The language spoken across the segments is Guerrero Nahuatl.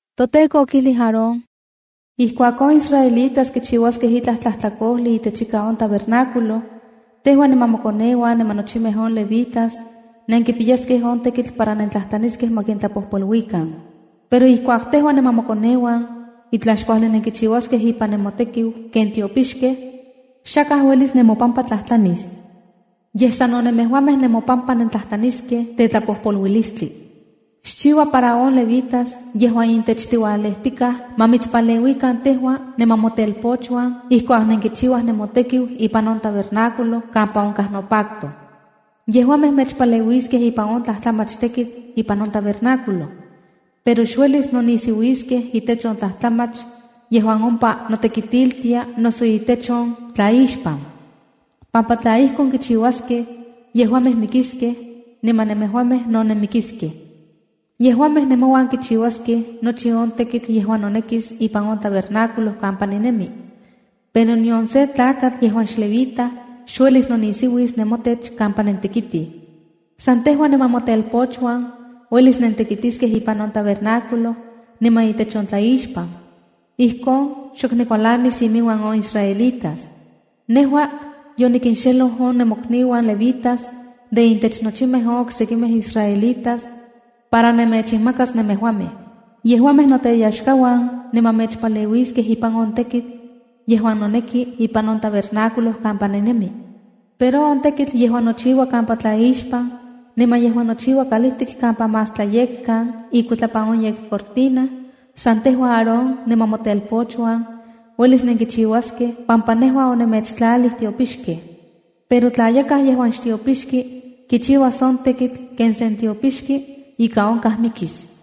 ToTEKO okijlij Aarón: “Ijkuak on israelitas kichiuaskej itlaj tlajtlakojli itechika on tabernáculo, tejua niman mokoneuan niman nochimej on levitas, nenkipiyaskej on tekitl para nentlajtlaniskej ma kintlapojpoluikan. Pero ijkuak tejua niman mokoneuan itlaj xkuajli nenkichiuaskej ipan nemotekiu ken tiopixkej, xakaj uelis nemopampa tlajtlanis. Yej sano nemejuamej nemopampa nentlajtlaniskej tetlajpojpoluilistli. ’Xchiua para on levitas yejuan intech tiualejtikaj, ma mitspaleuikan tejua niman motelpochuan ijkuak nenkichiuaj nemotekiu ipan on tabernáculo kampa onkaj nopacto. Yejuamej mechpaleuiskej ipan on tlajtlamach tekitl ipan on tabernáculo. Pero xuelis nonisiuiskej itech on tlajtlamach yejuan ompa notekitiltia noso itech on tlaixpan, pampa tla ijkon kichiuaskej, yejuamej mikiskej, niman nemejuamej no nenmikiskej. Yejuamej nemouan kichiuaskej nochi on tekitl yejuan nonekis ipan on tabernáculo kampa ninemi, pero nion se tlakatl yejuan xlevita uelis nonisiuis nemotech kampa nentekitij. San tejua niman motelpochuan uelis nentekitiskej ipan on tabernáculo niman itech on tlaixpan. Ijkon xok nikualanis iminuan on israelitas. Nejua yonikinxeloj on nemokniuan levitas de intech nochimej on oksekimej israelitas para nemechinmakas nemejuamej. Yejuamej noteyaxkauan niman mechpaleuiskej ipan on tekitl yejuan noneki ipan on tabernáculo kampa ninemi. Pero on tekitl yejuan nochiua kampa tlaixpan niman yejuan nochiua kalijtik kampa más Tlayekkan ikuitlapan on yekcortina, san tejua Aarón niman motelpochuan uelis nenkichiuaskej pampa nejua onemechtlalij tiopixkej. Pero tla yakaj yejuan xtiopixki kichiuas on tekitl ken sen tiopixki, ika onkaj mikis.”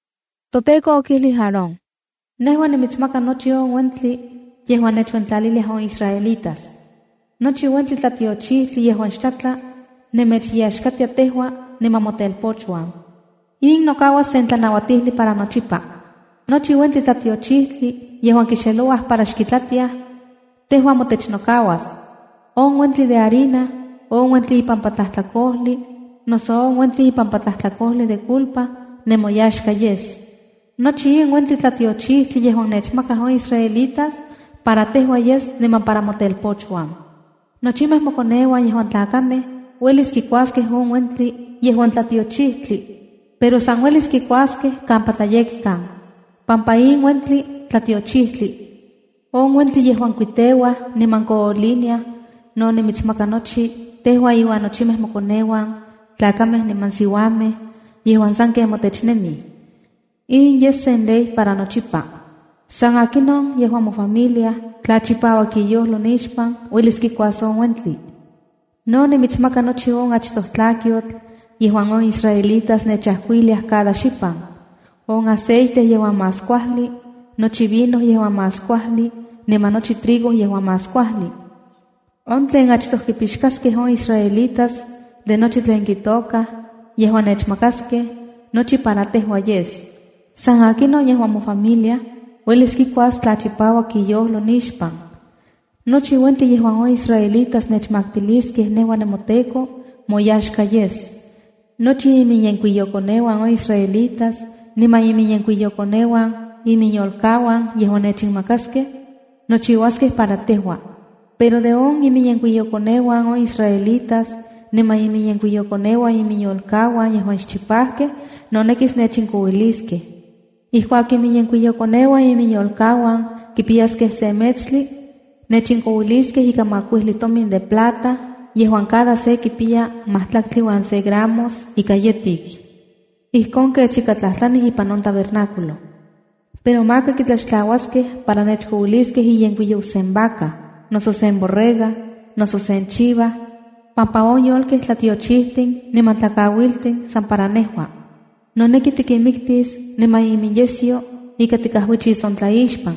ToTEKO okijlij Aarón: “Nejua nimitsmaka nochi on uentli yejuan nechuentlaliliaj on israelitas. Nochi uentli tlatiochijtli yejuan xtlatla, nemechaxkatia tejua niman motelpochuan. In nokauas sen tlanauatijli para nochipa. Nochi uentli tlatiochijtli yejuan kixelouaj para xkitlatiaj, tejua motech nokauas. On uentli de harina, on uentli ipampa tlajtlakojli, noso on uentli ipampa tlajtlakojli de culpa, nemoyaxka yes. Nochi in uentin tlatiochijtin yejuan nechmakaj on israelitas para tejua yes niman para motelpochuan. Nochimej mokoneuan yejuan tlakamej uelis kikuaskej in uentli yejuan tlatiochijtli, pero san uelis kikuaskej kampa tlayekkan, pampa in uentli tlatiochijtli. ’On uentli yejuan kuiteuaj niman kooliniaj, no nimitsmaka nochi, tejua iuan nochimej mokoneuan tlakamej niman siuamej yejuan sanken motech nemij. In yes sen ley para nochipa. San akinon yejuan mofamilia, tla chipauak iyojlo nixpan, uelis kikuas on uentli. No timitsmaka nochi on achtoj tlakyotl yejuan on israelitas nechajkuiliaj cada xipan: on aceite yejuan más kuajli, nochi vino yejuan más kuajli niman nochi trigo yejuan más kuajli. On tlen achtoj kipixkaskej on israelitas de nochi tlen kitokaj yejuan nechmakaskej, nochi para tejua yes. San akinon yejuan mofamilia uelis kikuas tla chipauak iyojlo nixpan. Nochi uentli yejuan on israelitas nechmaktiliskej nejua nemoTEKO, moyaxka yes. Nochi iminyenkuiyokoneuan on israelitas niman iminyenkuiyokoneuan iminyolkauan yejuan nechinmakaskej nochiuaskej para tejua. Pero de on iminyenkuiyokoneuan on israelitas niman iminyenkuiyokoneuan iminyolkauan yejuan xchipajkej, nonekis nechinkouiliskej. Ijkuak iminyenkuiyokoneuan iminyolkauan kipiyaskej se metstli, nechinkouiliskej ika makuijli tomin de plata yejuan cada se kipiya majtlaktli uan se gramos ika yetik ijkon kech ika kitlajtlanij ipan on tabernáculo. ’Pero maka kitlaxtlauaskej para nechkouiliskej iyenkuiyou sen vaca, noso sen borrega noso sen chiva pampa on yolkej tlatiochijtin niman tlakauiltin san para nejua. Noneki tikinmiktis, niman iminyesyo ika tikajuichis on tlaixpan.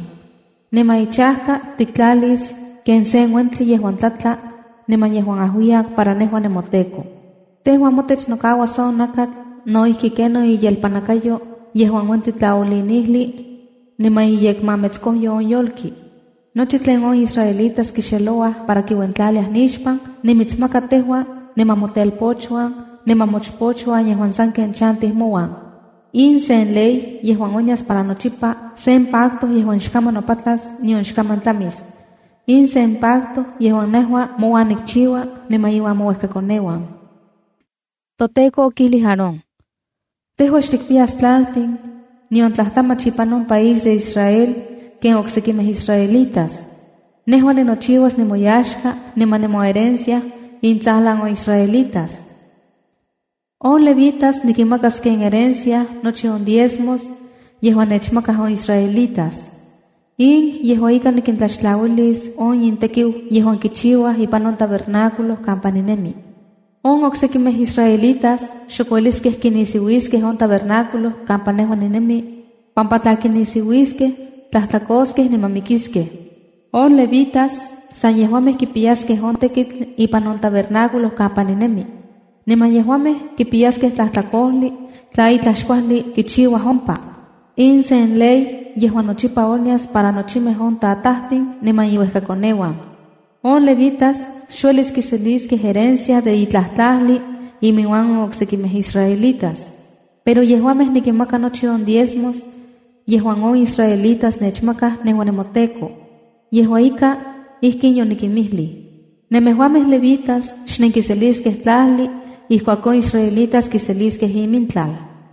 Niman ichajka tiktlatis ken sen uentli yejuan tlatla niman yejuan ajuiyak para nejua nemoTEKO. Tejua motech nokauas on nakatl, no ijki kenon iyelpannakayo yejuan uentli tlaoolinijli niman iyekmametskojyo on yolki. Nochi tlen on israelitas kixelouaj para kiuentlaliaj nixpan, nimitsmaka tejua niman motelpochuan niman mochpochuan yejuan sanken chantij mouan. In sen ley yejuan onyas para nochipa, sen pacto yejuan xkaman nopatlas nion xkaman tlamis. In sen pacto yejuan nejua mouan nikchiua niman iuan mouejkakoneuan.” ToTEKO okijlij Aarón: “Tejua xtikpiyas tlaltin nion tlajtlamach ipan on país de Israel ken on oksekimej israelitas. Nejua ninochiuas nimoyaxka niman nimoherencia intsajlan on israelitas. ’On levitas nikinmakas ken herencia nochi on diezmos yejuan nechmakaj on israelitas. In yejua ika nikintlaxtlauilis on intekiu yejuan kichiuaj ipan on tabernáculo kampa ninemi. On oksekimej israelitas xok ueliskej kinisiuiskej on tabernáculo kampa nejua ninemi, pampa tla kinisiuiskej, tlajtlakoskej niman mikiskej. On levitas san yejuamej kipiyaskej on tekitl ipan on tabernáculo kampa ninemi. Niman yejuamej kipiyaskej tlajtlakojli tla itlaj xkuajli kichiuaj ompa. In sen ley yejuan nochipa onyas para nochimej on tatajtin niman inuejkakoneuan. On levitas xuelis kiseliskej herencia de itlaj tlajli iminuan on oksekimej israelitas. Pero yejuamej nikinmaka nochi on diezmos yejuan on israelitas nechmakaj nejua nemoTEKO. Yejua ika, ijkin yonikimijlij: Nemejuamej Levitas xnenkiseliskej tlajli ijkuak on israelitas kiseliskej imintlal.”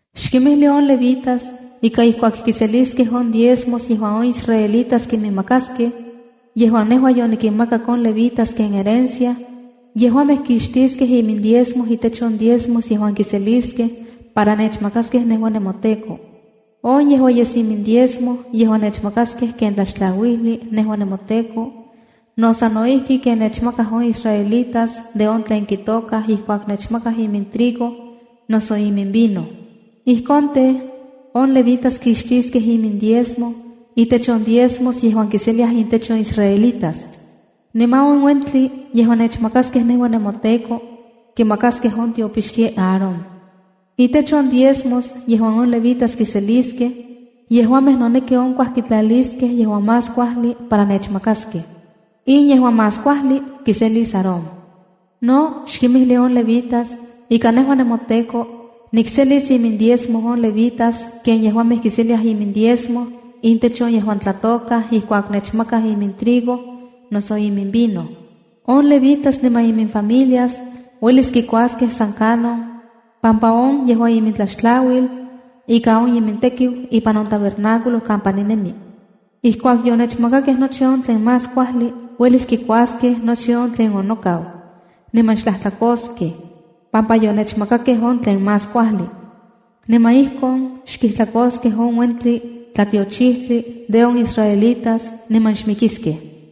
“Xkinmijli on levitas ika ijkuak kiseliskej on diezmos yejuan on israelitas kiminmakaskej, yejuan nejua yonikinmakak on levitas ken herencia, yejuamej kixtiskej imindiezmo itech on díezmos yejuan kiseliskej, para nechmakaskej nejua, nemoTEKO. On yejua yes imindiezmo yejuan nechamakaskej ken tlaxtlauijli nejua nemoTEKO no sa no ijki ken nechmakaj on israelitas de on tlen kitokaj ijkuak nechmakaj imintrigo noso iminvino. Ijkon tej, on levitas kixtiskej imindiezmo itech on diezmos yejuan kiseliaj intech on israelitas. Niman on uentli yejuan nechmakaskej nejua nemoTEKO, kimakaskej on tiopixki Aarón. Itech on diezmos yejuan on levitas kiseliskej, yejuamej noneki onkuaj kitlaliskej yejuan más kuajli para nechmakaskej. In yejuan más kuajli kiselis Aarón. ’No xkimijli on levitas ika nejua, nemoTEKO, nikselis imindiezmo on levitas ken yejuamej kiseliaj imindiezmo intech on yejuan tlatokaj ijkuak nechmakaj imintrigo noso iminvino. On levitas niman iminfamilias uelis kikuaskej san kanon, pampa on yejua imintlaxtlauil ika on imintekiu ipan on tabernáculo kampa ninemi. Ijkuak yonechmakakej nochi on tlen más kuajli, uelis kikuaskej nochi on tlen onokau, niman xtlajtlakoskej, pampa yonechmakakej on tlen más kuajli. Niman ijkon xkijtlakoskej on uentli tlatiochijtli de on israelitas niman xmikiskej.”